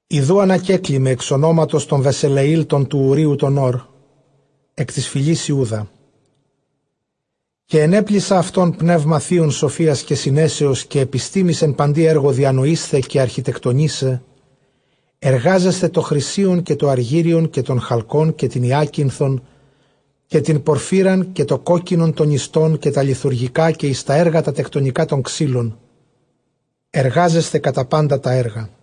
ἰδοὺ ἀνακέκλημαι ἐξ ὀνόματος τὸν Βεσελεὴλ τὸν τοῦ Οὐρείου τὸν Ὣρ, ἐκ τῆς φυλῆς Ἰούδα. Καὶ ἐνέπλησα αὐτὸν πνεῦμα θεῖον σοφίας καὶ συνέσεως καὶ ἐπιστήμης, ἐν παντὶ ἔργῳ διανοεῖσθαι, καὶ ἀρχιτεκτονῆσαι, ἐργάζεσθαι τὸ χρυσίον, καὶ τὸ ἀργύριον, καὶ τὸν χαλκὸν, καὶ τὴν ὑάκινθον, καὶ τὴν πορφύραν, καὶ τὸ κόκκινον τὸ νηστὸν, καὶ τὰ λιθουργικὰ, καὶ εἰς τὰ ἔργα τὰ τεκτονικὰ τῶν ξύλων, ἐργάζεσθαι κατὰ πάντα τὰ ἔργα.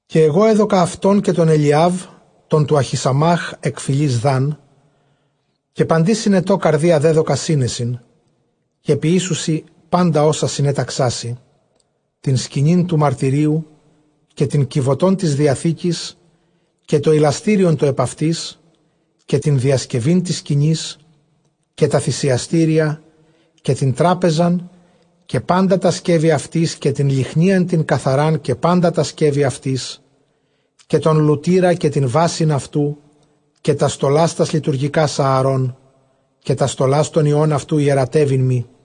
Καὶ ἐγὼ ἔδωκα αὐτὸν καὶ τὸν Ἐλιὰβ τὸν τοῦ Ἀχισαμὰχ ἐκ φυλῆς Δάν· καὶ παντὶ συνετῷ καρδίᾳ δέδωκα σύνεσιν· καὶ πονήσουσι πάντα ὅσα συνέταξά σοι, τὴν σκηνὴν τοῦ μαρτυρίου, καὶ τὴν κιβωτὸν τῆς διαθήκης, καὶ τὸ ἱλαστήριον τὸ ἐπʼ αὐτῆς, καὶ τὴν διασκευὴν τῆς σκηνῆς, καὶ τὰ θυσιαστήρια, καὶ τὴν τράπεζαν καὶ πάντα τὰ σκεύη αὐτῆς, καὶ τὴν λυχνίαν τὴν καθαρὰν καὶ πάντα τὰ σκεύη αὐτῆς καὶ τὸν λουτῆρα καὶ τὴν βάσιν αὐτοῦ, καὶ τὰς στολὰς τὰς λειτουργικὰς Ἀαρὼν, καὶ τὰς στολὰς τῶν υἱῶν αὐτοῦ ἱερατεύειν μοι,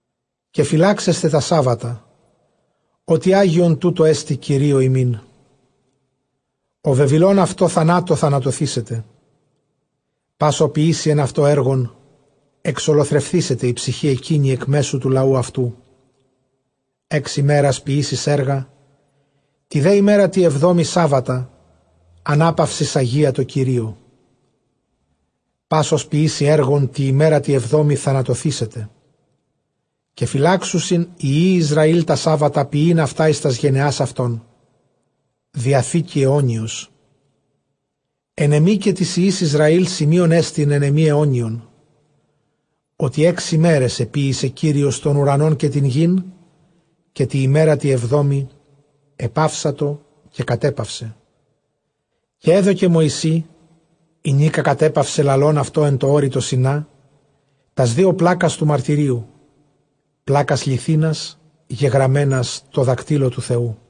καὶ φυλάξεσθε τὰ σάββατα, ὅτι ἅγιον τοῦτό ἐστι Κυρίῳ ὑμῖν· ὁ βεβηλῶν αὐτὸ, θανάτῳ θανατωθήσεται· πᾶς ὃς ποιήσει ἐν αὐτῷ ἔργον, ἐξολοθρευθήσεται ἡ ψυχὴ ἐκείνη ἐκ μέσου τοῦ λαοῦ αὐτοῦ. ἓξ ἡμέρας ποιήσεις ἔργα, τῇ δὲ ἡμέρᾳ τῇ ἑβδόμῃ σάββατα, ἀνάπαυσις ἁγία τῷ κυρίῳ· πᾶς ὃς ποιήσει ἔργον τῇ ἡμέρᾳ τῇ ἑβδόμῃ θανατωθήσεται. Καὶ φυλάξουσιν οἱ υἱοὶ Ἰσραὴλ τὰ σάββατα, ποιεῖν αὐτὰ εἰς τὰς γενεὰς αὐτῶν· Διαθήκη αἰώνιος ἐν ἐμοὶ καὶ τοῖς υἱοῖς Ἰσραὴλ, σημεῖόν ἐστιν ἐν ἐμοὶ αἰώνιον· ὅτι ἓξ ἡμεραις ἐποίησε Κύριος τὸν οὐρανὸν καὶ τὴν γῆν, καὶ τῇ ἡμέρᾳ τῇ ἑβδόμῃ κατέπαυσε, καὶ ἐπαύσατο. Καὶ ἔδωκε Μωυσῇ ἡνίκα κατέπαυσε λαλῶν αὐτῷ ἐν τῷ ὄρει τῷ Σινὰ, τὰς δύο πλάκας τοῦ μαρτυρίου, πλάκας λιθίνας γεγραμμένας τῷ δακτύλῳ τοῦ Θεοῦ.